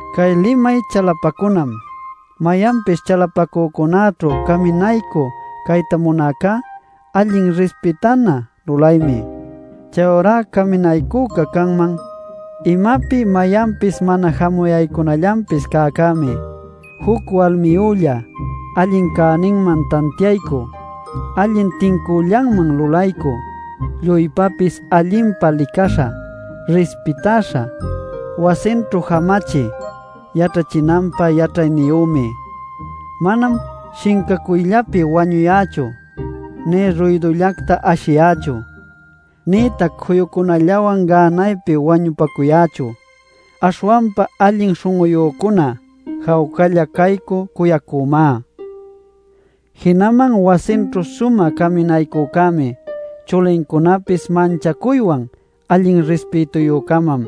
Cay limay chalapacunam: mayanpis chalapacücunäćhu caminaycü cayta munäcá, allin rispitana lulaymi. Chayurá caminaycüca canman: imapi mayanpis mana jamuyaycunallanpis cäcämi, juc walmiyülla, allin cäninman tantiaycü, allin tincüllanman lulaycü, lluypapis allinpa licaśha, rispitäśha, wasinćhu jamachï, yaćhachinanpä yaćhayniyümi. Manam shincacuyllapi wañuyächu, nï ruydullacta ashiyächu, nïtac juyucunallawan gänaypi wañupacuyächu, aśhwanpa allin śhun'uyücuna, jawcalla caycü cuyacümá. Jinaman wasinćhu sumä caminaycücämi, chulincunapis manchacuywan allin rispïtuyü-camam.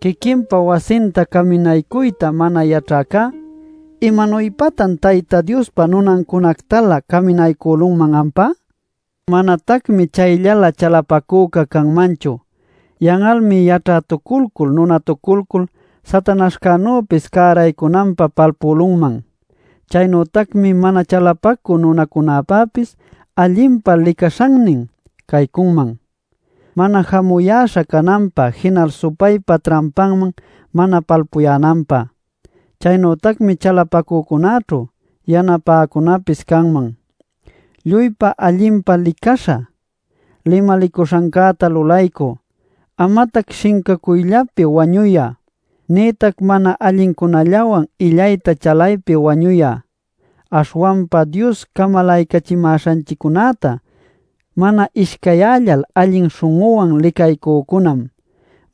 (Quiquinpa wasinta caminaycuyta mana yaćhäcá ¿imanuypatan Tayta Diospa nunancunactalä caminaycülunman ampá?) Manatacmi chayllalä chalapacüca canmanchu; Yan'almi yaćhätuculcul nunatuculcul Satanaśhcänüpis cäraycunanpä palpülunman. Chaynütacmi mana chalapacü nunacunäpäpis allinpa licaśhannin caycunman, mana jamuyäśha cananpä jinal supaypa trampanman mana palpuyänanpä. Chaynütacmi chalapacücunäćhu yanapäcunäpis canman: lluypa allinpa licaśha, limalicuśhancäta lulaycü, amatac shincacuyllapi wañuyä, nïtac mana allincunallawan illayta chalaypi wañuyá. Aśhwanpa Dios camalaycachimäśhanchiccunäta mana ishcayyällal allin śhun'uwan licaycücunam.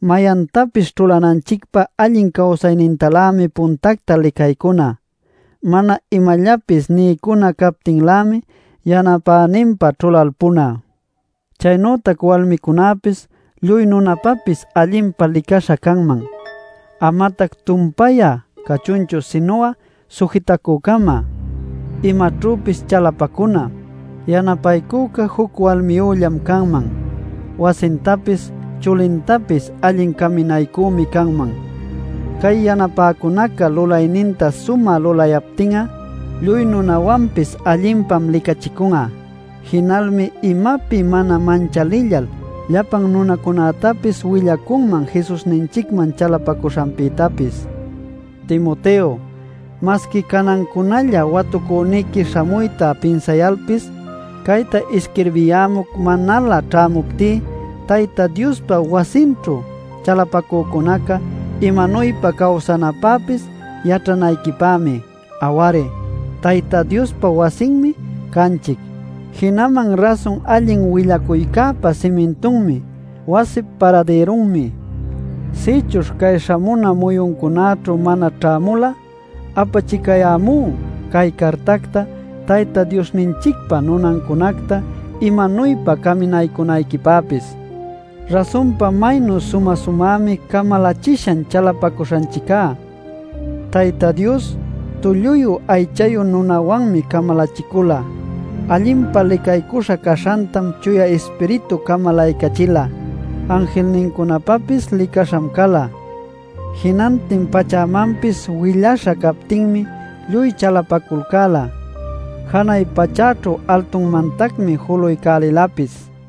Mayantapis ćhulananchicpä allin cawsaynintalämi puntacta licaycuna. Mana imallapis niycuna captinlämi yanapäninpä ćhulalpuna. Chaynütac walmicunäpis lluy nunapapis allinpa licaśha canman, amatac tumpayä cachunchu sinu'a sujitacü-cama, imaćhüpis chalapacuna. Yanapaycüca juc walmiyüllam canman, wasintapis chulintapis allin caminaycümi canman. Cay yanapäcunaca lulayninta sumä lulayaptin'a lluy nunawanpis allinpam licachicun'a. Jinalmi imapi mana manchalillal llapan nunacunätapis willacunman Jesusninchicman chalapacuśhanpïtapis. Timoteo, masqui canancunalla watucüniqui śhamuyta pinsayalpis, cayta isquirbiyämuc manalä ćhämuptí Tayta Diospa wasinćhu chalapacücunaca imanuypa cawsanapäpis yaćhanayquipämi. Aw-ari, Tayta Diospa wasinmi canchic, jinaman rasun allin willacuycäpä simintunmi, wasip paradïrunmi. Sïchuśh cay śhamuna muyuncunäćhu mana ćhämul'a apachicayämú cay cartacta Tayta Diosninchicpa nunancunacta imanuypa caminaycunayquipäpis. Rasunpa, maynu sumä-sumämi camalachishan chalapacuśhanchic'a: Tayta Dios tulluyu aychayu nunawanmi camalachicula; Allinpa licaycuśha caśhantam Chuya Ispiritu camalaycachila. Anjilnincunäpäpis licaśham cala. Jinantin pachämanpis willaśha captinmi lluy chalapaculcäla; Janay pachäćhu altumantacmi julaycälilapis.